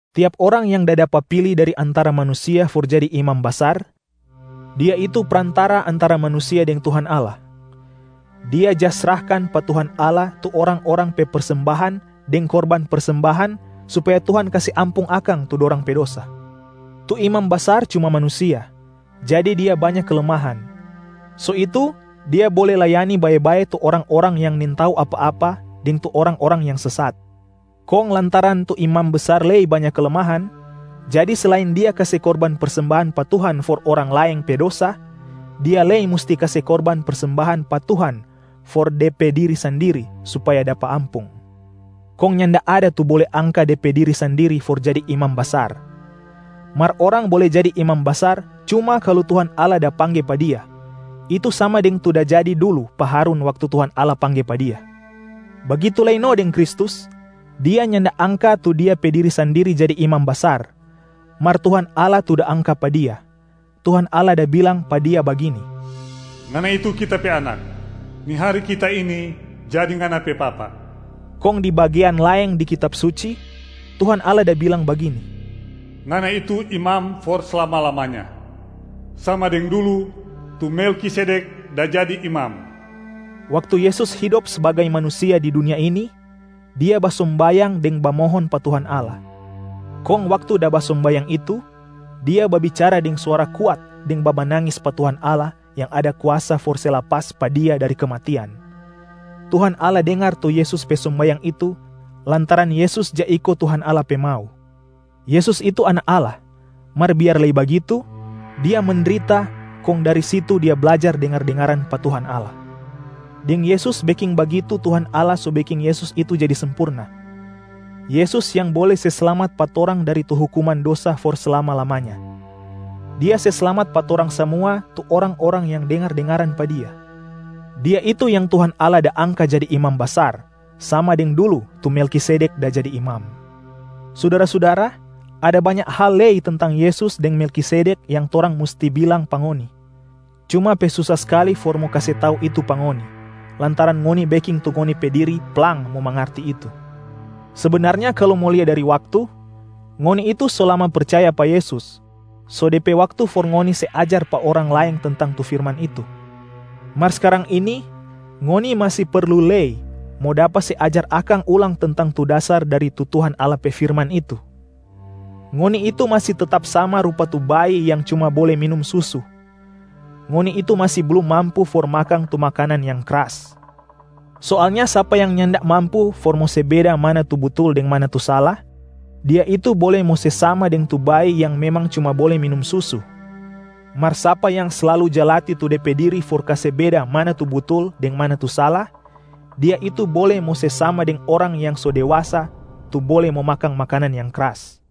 Tiap orang yang da dapa pili dari antara manusia for jadi imam basar, dia itu prantara antara manusia deng Tuhan Allah. Dia ja srahkan pa Tuhan Allah tu orang-orang pe persembahan deng korban persembahan supaya Tuhan kase ampung akang tu dorang pe dosa. Tu imam basar cuma manusia jadi dia banya kelemahan, so itu dia bole layani bae-bae tu orang-orang yang nintau apa-apa deng tu orang-orang yang sesat. Kong lantaran tu imam basar lei banya kelemahan, jadi selain dia kase korban persembahan pa Tuhan for orang laeng pe dosa, dia lei musti kase korban persembahan pa Tuhan for de pe diri sandiri supaya dapa ampung. Kong nyanda ada tu bole angka de pe diri sandiri for jadi imam basar. Mar orang bole jadi imam basar cuma kalu Tuhan Allah da pangge pa dia, itu sama deng tu da jadi dulu pa Harun waktu Tuhan Allah pangge pa dia. Bagitu lei no deng Kristus, Dia nyanda angka tu Dia pe diri sandiri jadi Imam Basar, mar Tuhan Allah tu da angka pa Dia, Tuhan Allah da bilang pa Dia bagini, “Ngana itu Kita pe Anak, ni hari Kita ini jadi Ngana pe Papa.” Kong di bagean laeng di Kitab Suci, Tuhan Allah da bilang bagini, “Ngana itu Imam for slama-lamanya, sama deng dulu tu Melkisedek da jadi imam.” Waktu Yesus hidop sbagai manusia di dunia ini, Dia basombayang deng bamohon pa Tuhan Allah. Kong waktu da basombayang itu, Dia babicara deng suara kuat deng bamanangis pa Tuhan Allah yang ada kuasa for se lapas pa Dia dari kematian. Tuhan Allah dengar tu Yesus pe sombayang itu lantaran Yesus ja iko Tuhan Allah pe mau. Yesus itu Anak Allah, mar biar lei bagitu, Dia mendrita kong dari situ Dia blajar dengar-dengaran pa Tuhan Allah. Deng Yesus beking bagitu Tuhan Allah so beking Yesus itu jadi sempurna, Yesus yang bole se slamat pa torang dari tu hukuman dosa for slama-lamanya. Dia se slamat pa torang samua tu orang-orang yang dengar-dengaran pa Dia. Dia itu yang Tuhan Allah da angka jadi Imam Basar sama deng dulu tu Melkisedek da jadi imam. Sudara-sudara, ada banya hal lei tentang Yesus deng Melkisedek yang torang musti bilang pa ngoni, cuma pe susa skali for mo kase tau itu pa ngoni, lantaran ngoni beking tu ngoni pe diri plang mo mangarti itu. Sebenarnya kalu mo lia dari waktu, ngoni itu so lama percaya pa Yesus, so de pe waktu for ngoni se ajar pa orang laeng tentang tu firman itu. Mar skarang ini ngoni masi perlu lei mo dapa se ajar akang ulang tentang tu dasar dari tu Tuhan Allah pe firman itu. Ngoni itu masi tetap sama rupa tu bayi yang cuma bole minum susu, ngoni itu masi blum mampu for makang tu makanan yang kras. Soalnya sapa yang nyanda mampu for mo se beda mana tu butul deng mana tu sala, dia itu bole mo se sama deng tu bayi yang memang cuma bole minum susu. Mar sapa yang slalu ja latih tu de pe diri for kase beda mana tu butul deng mana tu sala, dia itu bole mo se sama deng orang yang so dewasa tu bole mo makang makanan yang kras.